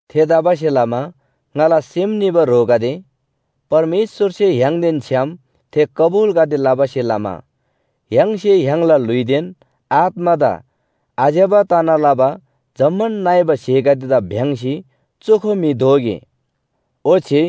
थेतबासेलमा ङाला सेम निबा ह्रोगदे, परमेश्‍वरसे य्‍हाङदेन छ्‌याम थे कबुलगदे लबासे लमा य्‍हाङसे य्‍हाङला ल्‍हुइदेन आत्‍मादा आज्‍यबा तना लबा जम्‍मान नइबा स्‍हेगदेदा भ्‍याङ्‍सी चोखो म्‍हि दोगे। ओच्‍छे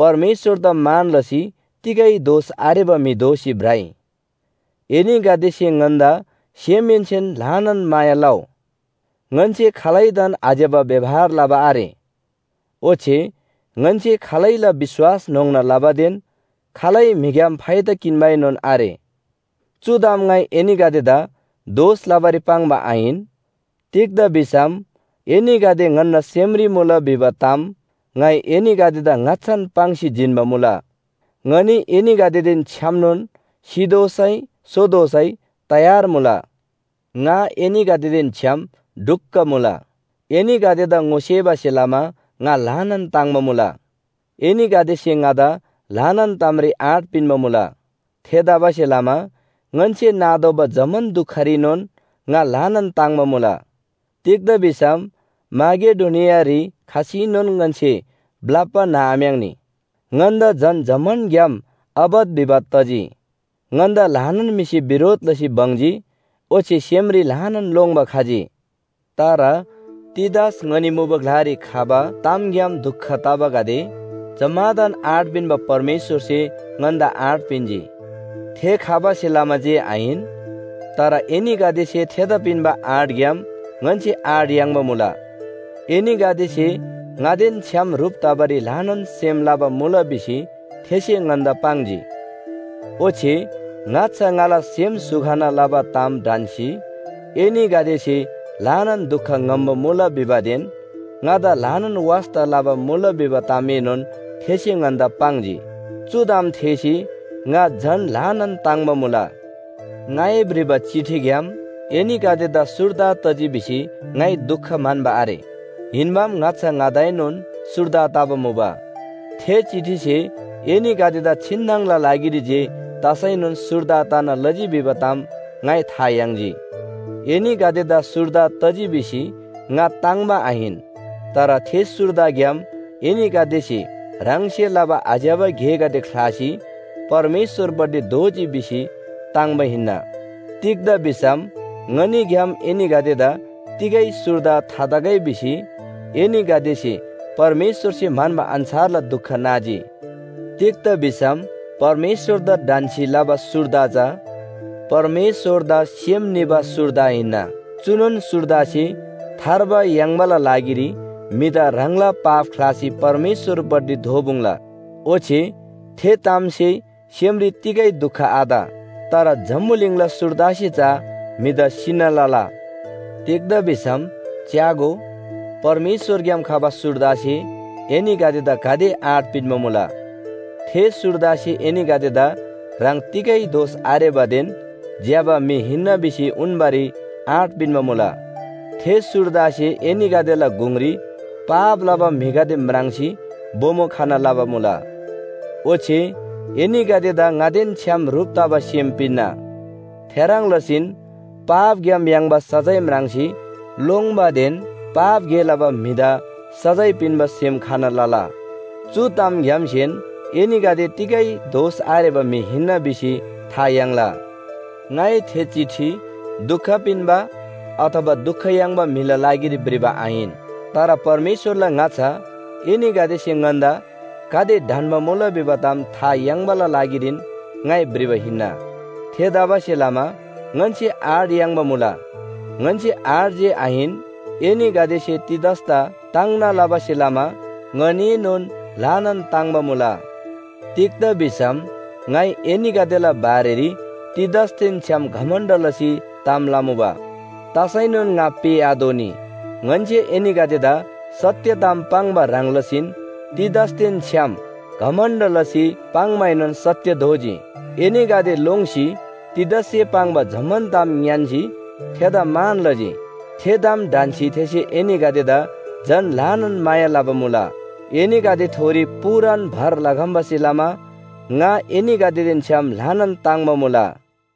परमेश्‍वरदा मान लसी तिगै दोष आरेबा म्‍हि दोसी भ्रइ। एनीगदेसे ङन्‍दा सेमहेन्‍सेन ल्‍हानान माया लउ। ङन्‍से खालैदान आज्‍यबा व्‍यवहार लबा आरे। ओच्‍छे ङन्‍से खालैला विश्‍वास न्‍होङ्ना लबादेन खालै म्‍हिग्‍याम फाइदा किन्‍बाएनोन आरे। चु ताम ङाइ एनीगदेदा दोष लबारी पाङ्बा आहिन। तिग्‍दा भिसम एनीगदे ङन्‍ना सेमरी मुला भिबा ताम ङाइ एनीगदेदा ङाच्‍छान पाङ्सी जिन्‍बा मुला। ङनी एनीगदेदेन छ्‌यामनोन सितोःसै सोतोःसै तयार मुला। ङा एनीगदेदेन छ्‌याम ढुक्‍क मुला। एनीगदेदा ङोसेबासे लमा ङा ल्‍हानान ताङ्‍बा मुला, एनीगदेसे ङादा ल्‍हानान तामरी आँट पिन्‍बा मुला। थेतबासेलमा ङन्‍से नातोःबा जम्‍मान दुखरीनोन ङा ल्‍हानान ताङ्‍बा मुला। तिग्‍दा भिसम माकेडोनियारी खसीनोन ङन्‍से ब्‍लप्‍बा न्‍हआम्‍याङ्‌नी। ङन्‍दा झन जम्‍मानग्‍याम आपत विपत तजी। ङन्‍दा ल्‍हानान म्‍हिसे बिरोध लसी बङ्जी ओच्‍छे सेमरी ल्‍हानान लोङ्‌बा खजी। तर तीतस ङनी मुबा ग्‍लारी खबा तामग्‍याम दुख तबागदे जम्‍मादान आँट पिन्‍बा परमेश्‍वरसे ङन्‍दा आँट पिन्‍जी। थे खबासे लमा जे आहिन, तर एनीगदेसे थेदा पिन्‍बा आँटग्‍याम ङन्‍से आँट याङ्बा मुला। एनीगदेसे ङादेन छ्‌याम ह्रुप तबारी ल्‍हानान सेम लबा मुला भिसी थेसे ङन्‍दा पाङ्जी। ओच्‍छे ङाच्‍छा ङाला सेम स्‍हु खना लबा ताम ढन्‍सी एनीगदेसे ल्‍हानान दुख ङ्‍हम्‍बा मुला भिबादेन ङादा ल्‍हानान वास्‍ता लबा मुला भिबा तामएनोन थेसे ङन्‍दा पाङ्जी। चु ताम थेःसी ङा झन ल्‍हानान ताङ्‍बा मुला। ङाइ भ्रिबा चिठीग्‍याम एनीगदेदा सुर्दा तजी भिसी ङाइ दुख म्‍हन्‍बा आरे, हिन्‍बाम ङाच्‍छा ङादाएनोन सुर्दा तबा मुबा। थे चिठीसे एनीगदेदा छिन्‍नङला लागिरी जे तसैनोन सुर्दा तना लजी भिबा ताम ङाइ था याङ्जी। एनीगदेदा सुर्दा तजी भिसी ङा ताङ्‍बा आहिन, तर थे सुर्दाग्‍याम एनीगदेसे ह्राङसे लबा आज्‍यबा गेगदे ख्‍लासी परमेश्‍वरपट्टि दोःजी भिसी ताङ्‍बा हिन्‍ना। तिग्‍दा भिसम ङनीग्‍याम एनीगदेदा तिगै सुर्दा थातगै भिसी एनीगदेसे परमेश्‍वरसे म्‍हन्‍बा अन्‍छारला दुख नाजी। तिग्‍दा भिसम परमेश्‍वरदा ढन्‍सी लबा सुर्दा चा परमेश्‍वरदा सेम निबा सुर्दा हिन्‍ना। चुनोन सुर्दासे थार्बा याङ्बाला लागिरी म्‍हिदा ह्राङला पाप ख्‍लासी परमेश्‍वरपट्टि दोःपुङ्ला। ओच्‍छे थे तामसे सेमरी तिगै दुख आत। तर जम्‍बुलिङला सुर्दासे चा म्‍हिदा सिना लला। तिग्‍दा भिसम च्‍यागो, परमेश्‍वरग्‍याम खबा सुर्दासे एनीगदेदा गाते आँट पिन्‍बा मुला। थे सुर्दासे एनीगदेदा ह्राङ तिगै दोष आरेबादेन ज्‍यबा म्‍हि हिन्‍ना भिसी उन्‍बारी आँट पिन्‍बा मुला। थे सुर्दासे एनीगदेला गुङरी पाप लबा म्‍हिगदे म्राङ्सी बोमो खना लबा मुला। ओच्‍छे एनीगदेदा ङादेन छ्‌याम ह्रुप तबा सेम पिन्‍ना। थेह्रङ् लसीन पापग्‍याम याङ्बा सजाय म्राङ्सी लोङ्बादेन पाप गे लबा म्‍हिदा सजाय पिन्‍बा सेम खना लला। चु तामग्‍यामसेन एनीगदे तिगै दोष आरेबा म्‍हि हिन्‍ना भिसी था याङ्ला। ङाइ थे चिठी दुख पिन्‍बा अथवा दुख याङ्बा म्‍हिला लागिरी भ्रिबा आहिन। तर परमेश्‍वरला ङाच्‍छा एनीगदेसे ङन्‍दा गाते ढन्‍बा मुला भिबा ताम था याङ्बाला लागिरीन ङाइ भ्रिबा हिन्‍ना। थेतबासेलमा ङन्‍से आँट याङ्बा मुला। ङन्‍से आँट जे आहिन, एनीगदेसे तीतसदा ताङ्ना लबासे लमा ङनीएनोन ल्‍हानान ताङ्‍बा मुला। तिग्‍दा भिसम ङाइ एनीगदेला बारेरी तीतसदेन छ्‌याम घमण्‍ड लसी ताम लमुबा, तसैनोन ङा पेःआतोःनी। ङन्‍से एनीगदेदा सत्‍य ताम पाङ्बा ह्रङ् लसीन तीतसदेन छ्‌याम घमण्‍ड लसी पाङ्‌माएनोन सत्‍य दोजी। एनीगदे लोङ्सी तीतससे पाङ्बा जम्‍मान ताम ङ्‌यान्‍सी थेदा मान लजी। थे ताम ढन्‍सी थेसे एनीगदेदा झन ल्‍हानान माया लबा मुला। एनीगदेथोरी पूरान भर लखम्‍बासे लमा ङा एनीगदेदेन छ्‌याम ल्‍हानान ताङ्‍बा मुला।